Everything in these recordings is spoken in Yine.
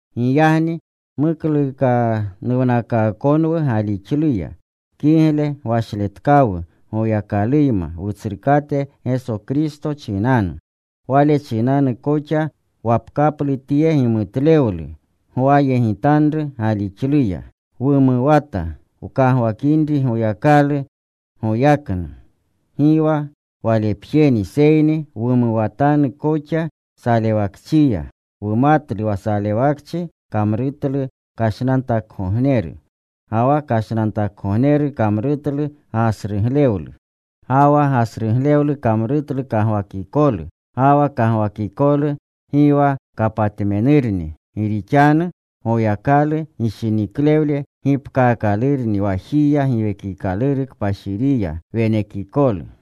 Giyagni muklukanuwnakaakonwu galixluya, kigle gwashletkawu Goyakaluyma Wutsrukate Geso Kristo chinanu. Wale chinanu koxa wapkaplu tye gimutlewlu gawyegitanru galixluya. Wumuwata wkagwakinri Goyakalu goyaknu. Gi wa walepjeni, seyni wumuwatanu koxa salewakchiya. Wumatlu wa salewakchi kamrutlu kashnantakgogneru. Ga wa kashnantakgogneru kamrutlu gasruglewlu. Ga wa gasruglewlu kamrutlu kagwakikolu. Ga wa kagwakikolu gi wa kapatmenurni. Gi rixanu Goyakalu gishiniklewle gipkaakalurni wajiya Giwekikaluru Kpashiriya, wenekikolu.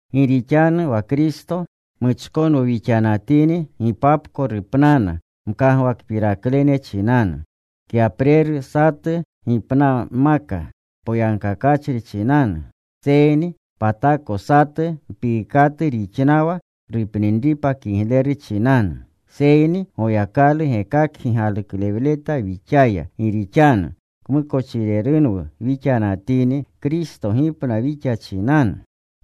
Gi rixanu wa Kristo muchkonwu wixanatini, gipapko rupnana mkagwakpiraklene chinanu. Kyapreru satu gipnanmaka poyagkakachri chinanu, seyni patako satu mpiikatu rixnawa rupninripa kigleru chinanu. Seyni Goyakalu gekakgi galuklewleta wixaya, gi rixanu, kmukochirerunwu wixanatini, Kristo gipna wixa chinanu.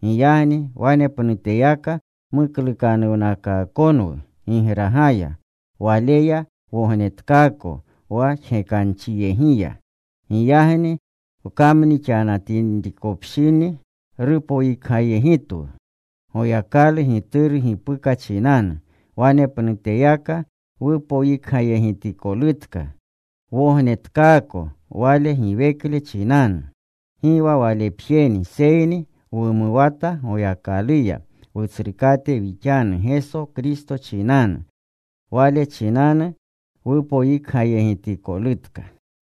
Giyagni wanepnuteyaka muklukanuwnakaakonwu gigragaya; Waleya wognetkaako wa jgekanchiyegiya. Giyagni wkamnixanatinrikopshini rupoyikgayegitinwu Goyakalu Gituru gipuka chinanu, wanepnuteyaka wupoyikgayegitikolutka, wognetkaako Wale giwekle chinanu. Gi wa walepjeni, seyni wumuwata Goyakaluya, Wutsrukate wixanu Geso Kristo chinanu. Wale chinanu wupoyikgayegitikolutka.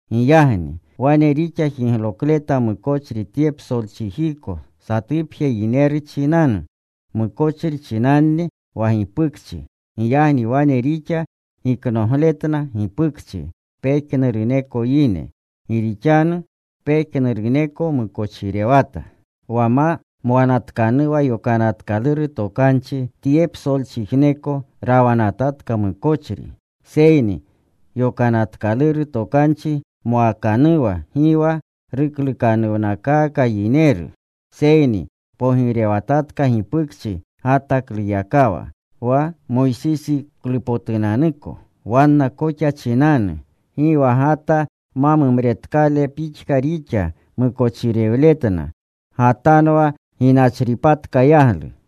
Giyagni, wane rixa jiglokleta mukochri tye psolchijiko satupje yineru chinanu. Mukochri chinanni wa gipukchi. Giyagni wane rixa giknogletna gipukchi pejnuruneko yine. Gi rixanu pejnuruneko mukochirewata. Wa ma mwanatkanuwa Yokanatkaluru Tokanchi, tye psolchijneko rawanatatka mukochri. Seyni Yokanataluru Tokanchi mwakanuwa gi wa ruklukanuwnakaaka yineru. Seyni pogirewatatka gipukchi Gatakluyakawa wa Moysisiklupotunanuko, wanna koxa chinanu gi wa Gata ma mumretkale pixka rixa mukochirewletna. Gatanwa ginachripatka yaglu.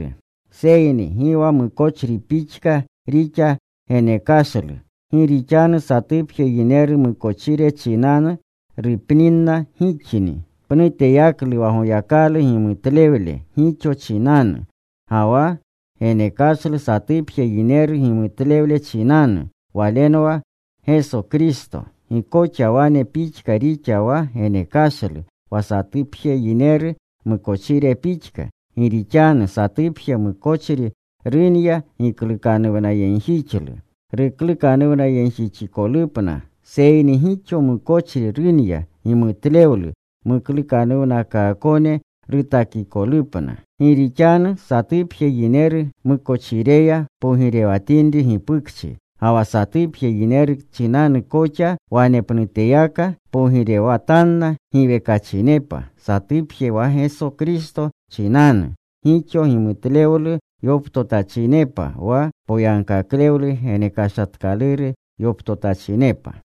Seyni gi wa mukochri pixka rixa genekashlu. Gi rixanu satupje yineru mukochire chinanu rupninna gixni, pnuteyaklu wa Goyakalu gimutlewle gixo chinanu, ga wa genekashlu satupje yineru gimutlewle chinanu. Walenwa Geso Kristo. Gi koxa wane pixka rixa wa genekashlu, wa satupje yineru mukochire pixka. Gi rixanu satupje mukochri runya giklukanuwnayegjixlu ruklukanuwnayegjixkolupna, seyni gixo mukochri runya gimutlewlu muklukanuwnakaakone rutakikolupna. Gi rixanu satupje yineru mukochireya pogirewatinri gipukchi ga wa satupje yineru chinanu koxa, wanepnuteyaka pogirewatanna giwekachinepa satupje wa Geso Kristo chinanu, gixo gimutlewlu yoptotachinepa, wa poyagkaklewlu genekashatkaluru yoptotachinepa.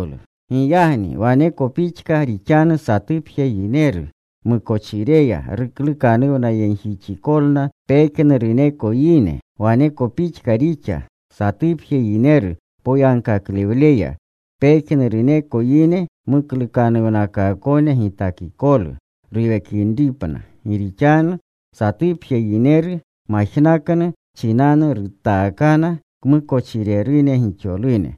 Giyagni waneko pixka rixanu satupje yineru mukochireya ruklukanuwnayegjixikolna pejnuruneko yine. Waneko pixka rixa: satupje yineru poyagkaklewleya, pejnuruneko yine muklukanuwnakaakone gitakikolu ruwekinripna. Gi rixanu satupje yineru majnaknu chinanu rutaakana kmukochirerune gixolune.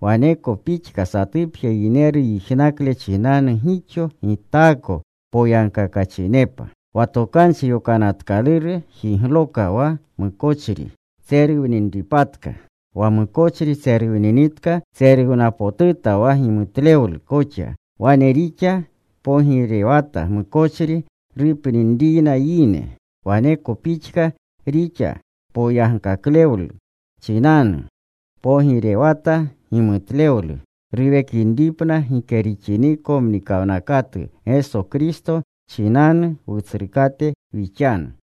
Waneko pixka satupje yineru yijnakle chinanu gixo gitaako poyagkakachinepa. Wa Tokanchi Yokanatkaluru jigloka wa mukochri tseruwninripatka. Wa mukochri tseruwninitka tseruwnapotuta wa gimutlewlu koxa. Wane rixa pogirewata mukochri rupninriyna yine, waneko pixka rixa poyagkaklewlu chinanu; pogirewata gimutlewlu ruwekinripna gike rixiniko mnikawnakatu Geso Kristo chinanu Wutsrukate wixanu.